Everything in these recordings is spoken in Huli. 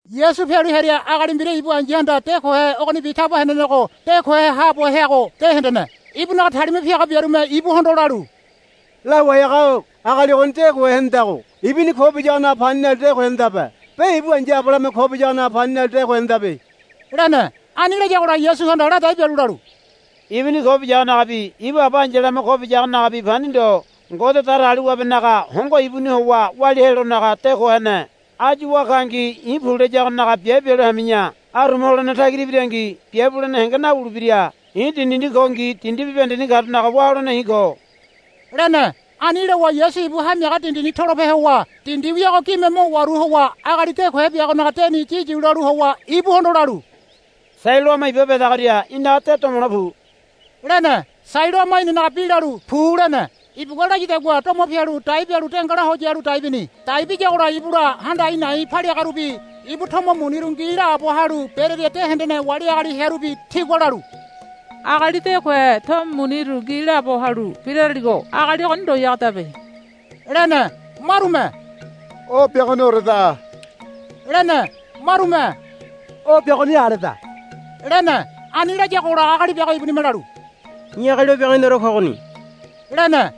Yasu pialu hearia agali mbira ibu ai̱yahanda de kohe ogonibi taba henenego de kohe haabo heago de hendene. Ibunaga talima piaga biarume ibuhondo lalu, Lawai haga-o agali ogoni de kohe henedago ibuni ko biyagonaga pani nalu de ko henedabe be ibu aba ai̱yalame ko biyagonaga pani nalu de ko henedabe, lene. Ani layagola Yasuhanda ladai bialu lalu, Ibuni ko biyagonagabi ibu aba ai̱yalame ko biyagonagabi pani ndo. Ngode Datagaliwabenaga hongo ibuni howa walia helonaga de ko hene. Áyu wá kangi i̱ pu layagonaga biabe bialu hami̱ya. Aruma holene tagira ibirangi biabe bulene henge nawulebira. I̱ dindini kongi dindi bibahendeni karunaga wá holene i̱ ko, lene. Ani lowa Yasu ibu hamiaga dindini tolope howa dindi wiago gime mo waru howa agali de kohe biagonaga deni yiyu lalu howa ibuhondo lalu Sailoama Iba bedagoria í̠naga de domole pu, lene. Sailoama inanaga bi lalu, Pu lene. Ibugua layadagua domo pialu dai bialu dengala ho yalu dai bini. Dai biyagola ibula handa a̱i̱ na̱i̱ paliagarubi ibu tomo muniru ngi laabo halu berearia de hendene wali agali hearubi tigua lalu, Agali de kohe tomo muniru ngi laabo halu biraraligo agali ogoni ndoyagodabe, lene. Marume, O biagonioreda, lene. Marume, O biagoni aleda, lene. Ani layagola agali biago ibunime lalu, I̱ agali o biagoniore kogoni, lene.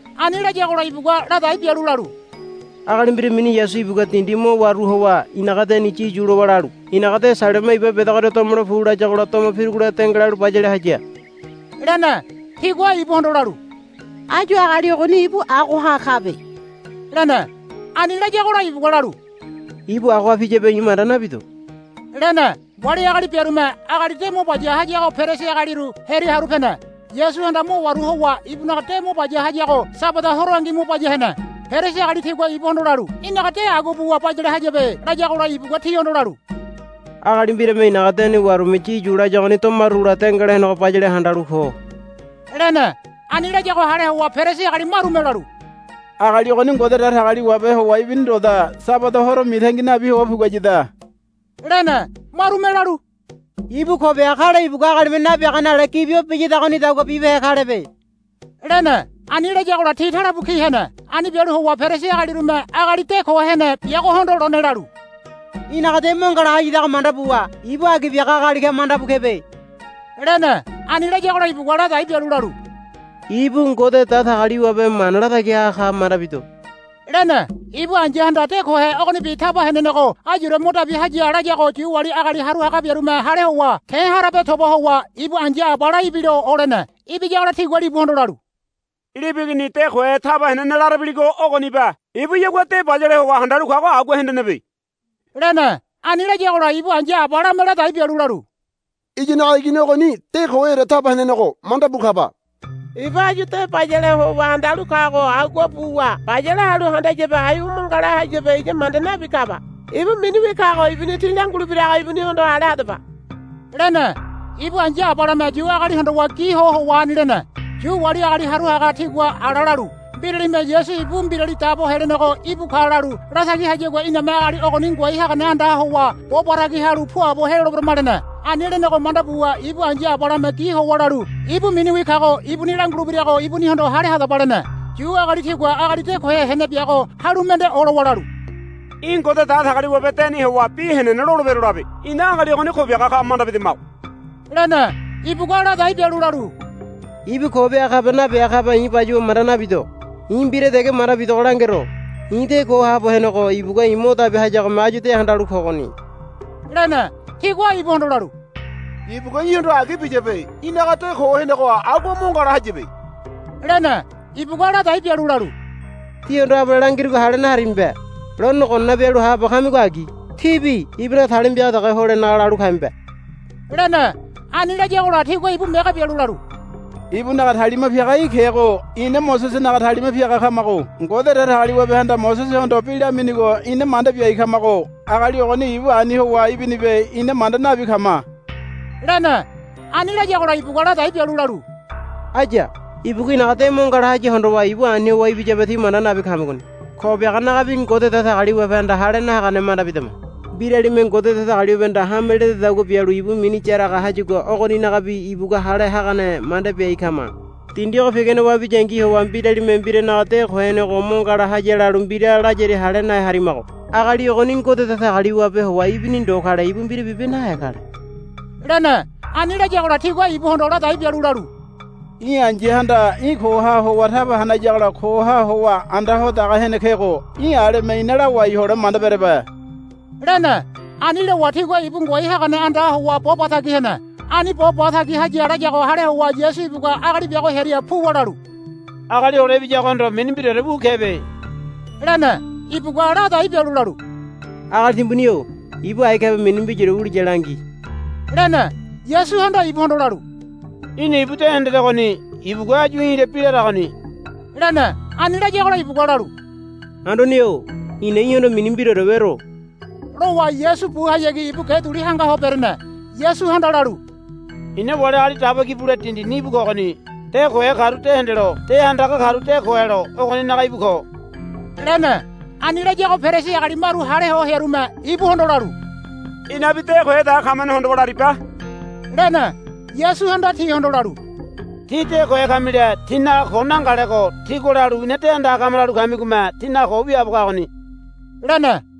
Ani layagola ibugua ladai bialu lalu, Agali mbira mini Yasu ibugua dindi mo waru howa i̱naga deni yiyu lowa lalu, Í̠naga de Sailoama Iba bedagoria domole pu, layagola domo pirugola dengalalu bayale haya, lene. Tigua ibuhondo lalu, Áyu agali ogoni ibu agoha kabe, lene. Ani layagola ibugua lalu, Ibu agoha piyabe i̱ manda nabido, lene. Wali agali biarume agali de mo baya hayago Perisi agaliru hearia haru pene. Yasuhanda mo waru howa ibunaga de mo baya hayago Sabada horongi mo baya hene. Perisi agali tigua ibuhondo lalu, Í̠naga de agua buwa bayale hayabe, layagola ibugua tihondo lalu, Agali mbirame i̱naga deni warume yiyu laya ogoni domarugola dengala henego bayale handalu ko, lene. Ani layago hale howa Perisi agali marume lalu, Agali ogoni Ngode Datagaliwabe howa ibini ndoda. Sabada horo mitangi nabi howa puguayada, lene. Marume lalu, Ibu ko biaga kale ibugua agalime nabiagane ale gibi o biyadagonidagua bibehe kalebe, lene. Ani layagola ti talebu ki hene. Ani bialu howa Perisi agalirume agali de ko hene biagohondo lone lalu, Í̠naga de mo ngala hayadago manda buwa ibu agi biaga agali ka manda bu kebe, lene. Ani layagola ibugua ladai bialu lalu, Ibu Ngode Datagaliwabe mana latagi haga ka manda bido, lene. Ibu ai̱yahanda de kohe ogonibi taba henenego ayure mo dabi haya layago Yu wali agali haru haga biarume hale howa ke̱ harabe toba howa ibu ai̱ya abala ibilo olene. Ibiyagola tigua libuhondo lalu, Libu igini de kohe taba henene larabiligo ogonibe. Ibuyagua de bayale howa handalu kago agua hendenebe, lene. Ani layagola ibu ai̱ya abalame ladai bialu lalu, Iyanaga igini ogoni de koheore taba henenego manda bu kaba. Ibu áyu de bayale howa handalu kago agua buwa bayale halu handayabe aiwa mo ngala hayabe iya manda nabi kaba. Ibu miniwi kago ibuni tí langulebirago ibunihondo hale hadaba, lene. Ibu ai̱ya abalame Yu agali hondowa gi ho howa ani lene. Yu wali agali haru haga tigua ala lalu, Mbiralime Yasu ibu Mbirali Dabo Helenego íbu ka lalu latagi hayagua iname agali ogoni ngoai hagane andaha howa bo ba tagi halu puabo heloleberama, lene. Ani lenego manda buwa ibu ai̱ya abalame gi howa lalu, Ibu miniwi kago ibuni langulebirago ibunihondo hale hadaba, lene. Yu agali tigua agali de kohe hene biago halu mende olowa lalu, Í̠ Ngode Datagaliwabe deni howa bi henene lolebero labe. Ina agali ogoni ko biaga ka manda bidamago, lene. Ibugua ladai bialu lalu, Ibu ko biaga kabe nabiaga kabe i̱ bayuwa manda nabido. I̱ mbira dege manda bidogo langero. I̱ de ko haabo henego ibugua mo dabi hayagome áyu de handalu kogoni, lene. Tigua ibuhondo lalu, Ibugua í̠hondo agi biyabe. Í̠naga de ko henego agua mo ngala hayabe, lene. Ibugua ladai bialu lalu, Tíhondo abale langirugo hale naharimibe. Lone gonana bialu haabo kamigo agi. Tíbi ibunaga talima piaga dege holenaga lalu kamibe, lene. Ani layagola tigua ibu mege bialu lalu, Ibunaga talima piaga í̠ kego ina Mosesenaga talima piaga kamago. Ngode Datagaliwabehanda Mosesehondo bi laminigo ina manda biai kamago. Agali ogoni ibu ani howa ibinibe ina manda nabi kama, lene. Ani layagola ibugua ladai bialu lalu, Aya. Ibugua i̱naga de mo ngala haya hondowa ibu ani howa ibiyabe tí manda nabi kamigoni. Ko biaganaga bi Ngode Datagaliwabehanda hale nahagane manda bidama. Mbiralime Ngode Datagaliwabehanda hame ledadagua bialu ibu mini yaraga hayagua ogoninaga bi ibugua hale hagane manda biai kama. Dindi ogo pigane wabiniyangi howa mbiralime mbiralinaga de ko henego mo ngala haya lalu mbira layaria hale nahe harimago. Agali ogoni Ngode Datagaliwabe howa ibini ndo kale ibu mbira bibe nahe kale, lene. Ani layagola tigua ibuhondo ladai bialu lalu, Í̠ ai̱yahanda í̠ koha howa taba hanayagola koha howa anda ho daga hene kego. Í̠ aleme ina lawai hole manda berebe, lene. Ani lowa tigua ibu ngoai hagane andaha howa bo ba tagi hene. Ani bo ba tagi haya layago hale howa Yasu ibugua agali biago hearia puwa lalu, Agali Hole Ibiyagohondo mini mbiraore wu kebe, lene. Ibugua ladai bialu lalu, Agali timbuni-o ibu ai kabe mini mbiraore wuliya langi, lene. Yasuhanda ibuhondo lalu, Í̠na ibu de hendedegoni. Ibugua áyu í̠la bi laragoni, lene. Ani layagola ibugua lalu, Anduane-o i̱na í̠hondo mini mbiraore wero, lowa Yasu buhayagi ibu ge duli hanga ho berene. Yasuhanda lalu, I̱na wali agali daba ki bule dindini íbu kogoni. De kohe karu de hendelo de handaga karu de ko helo ogoninaga íbu ko, lene. Ani layago Perisi agali maru hale ho hearume ibuhondo lalu, Inabi de kohe dege kamane hondowa laribe, lene. Yasuhanda tihondo lalu, Tí de kohe kamile tínaga ko nangalego tígua lalu, Ina de handaga kama, lalu kamigome tínaga ko wiaabo kagoni, lene.